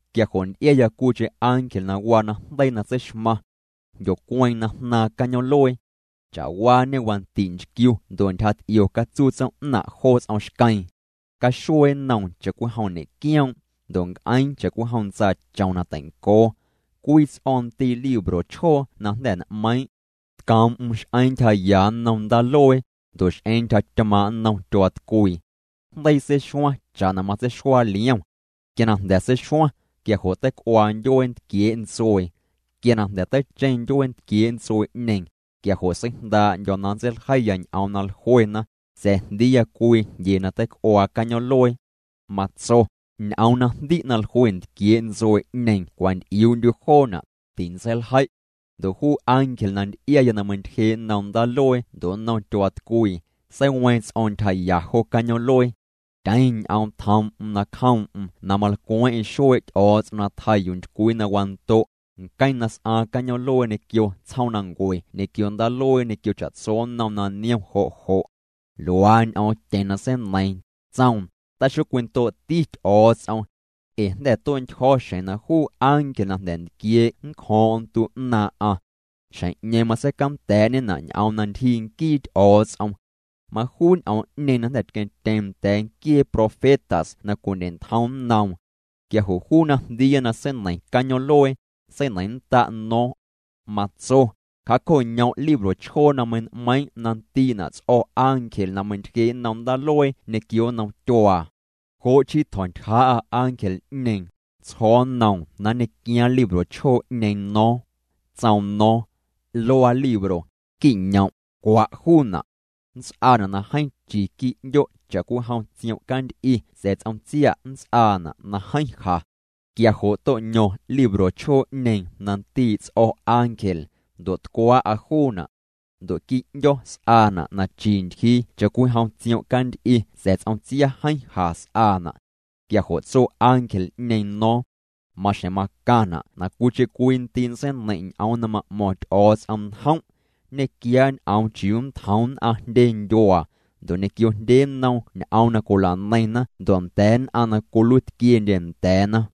Quia jo' nty'iaya cwiicheⁿ ángel na waa najndeii na tseixmaⁿ. Jndyocueeⁿ na jnaaⁿ cañoom'luee. Cha'waañê wandi' nchquiu ndo' ntyjaty'io catsuu tsoom'naⁿ' jo ts'om xqueeⁿ. Caxuee nnoom cha'cwijom ñe'quioom', ndo' nc'eeⁿ cha'cwijom ntsaachom na teincoo. Cwii ts'o̱o̱ⁿ ndii' libro chjoo na jnda̱ n'meiiⁿ'. Tcoom'm x'eeⁿ ntyjaya nnom ndaaluee, ndo' x'eeⁿ ntyjatymaaⁿ' nnom tyuaatcwii. Jndeii seixuaⁿ cha'na matseixuaa liom. Quia na jnda̱ seixuaⁿ, quia jo' teic'uaa ndyuee ntquiee' ntsuee. Quia na jnda̱ teicheⁿ ndyuee ntquiee' ntsuee'ñeeⁿ, quia jo' seijndaa'ndyo̱ na nntseiljeiya ñ'oom na jluena, sa̱a̱ jndiiya cwii jndyee na teic'uaa cañoom'luee. Matso: —Ñ'oom na jndi' na jlue ntquiee' ntsuee'ñeeⁿ cwanty'iuu'ndyu' joona', tintseiljei'. Ndo' juu ángel na nty'iaya na meintyjee' nnom ndaaluee ndo' nnom tyuaatcwii, seiweeⁿ ts'o̱o̱ⁿ ntyjaya jo cañoom'luee. Tyeⁿ ñ'oom tjoom'm na cjoom'm na malcweeⁿ'eⁿ xuee' Ty'o̱o̱ts'om na tjaa yuu ntycwii na wando', nqueⁿ na s'aaⁿ cañoom'luee ñequio tsjoomnancue ñequio ndaaluee ñequio cha'tso nnom na niom jo' jo'. Luaa ñ'oomtyeⁿ na seineiiⁿ, tsoom: —Taxocwindoo'ti Ty'o̱o̱ts'om. Ee jnda̱ tue'ntyjo̱ xjeⁿ na juu ángel na jnda̱ ntquiee' nncjo̱o̱ⁿ'o̱ⁿ ntu 'naaⁿ'aⁿ. Xjeⁿ'ñeeⁿ matseicanda̱a̱'ñena' ñ'oom na ntyjii nquii Ty'o̱o̱ts'om. Majuu ñ'oom'ñeeⁿ na jnda̱ tqueⁿtyeeⁿ nda̱a̱ nquiee profetas na cwindye'ntjomtyeⁿ nnoom. Quia jo' juu na jndiiya na seineiⁿ cañoom'luee, seineiⁿnnda' no̱o̱ⁿ. Matso: —Cja'co'ñom' libro chjoo na mein'meiiⁿ' na ndii'na' ts'o̱ ángel na meintyjee' nnom ndaaluee ñequio nnom tyuaa. Jo' chii tjo̱ntyjaa'a ángel'ñeeⁿ, tsjo̱o̱ nnoom na nñequiaaⁿ libro chjoo'ñeeⁿ no̱o̱ⁿ. Tsoom no̱o̱ⁿ: —Luaa libro. Qui'ñom', cwa' juuna'. Nnts'aana' na jeeⁿ chi quii' 'ndyo' cha'cwijom tsiom' canty'i sa̱a̱ ts'om tsia' nnts'aana' na jeeⁿ ja. Quia jo' to'ño̱ⁿ libro chjoo'ñeeⁿ na ndii' ts'o̱ ángel, ndo' tcwaa'a juuna'. Ndo' quii' 'ndyo̱ s'aana' na chi ntyjii cha'cwijom tsiom' canty'i sa̱a̱ ts'om tsia jeeⁿ ja s'aana'. Quia jo' tso ángel'ñeeⁿ no̱o̱ⁿ: —Maxjeⁿ macaⁿna' na cwiicheⁿ cwii ndii' nntseineiⁿ' ñ'oom na ma'mo̱ⁿ Ty'o̱o̱ts'om njom'. Nñequiaa' ñ'oom chiuu nntjoom nn'aⁿ jndye ndyuaa, ndo' ñequio jndye nnom ñ'oom na cwila'neiⁿna ndo' nda̱a̱ nn'aⁿ na cwiluitquiendye nda̱a̱na.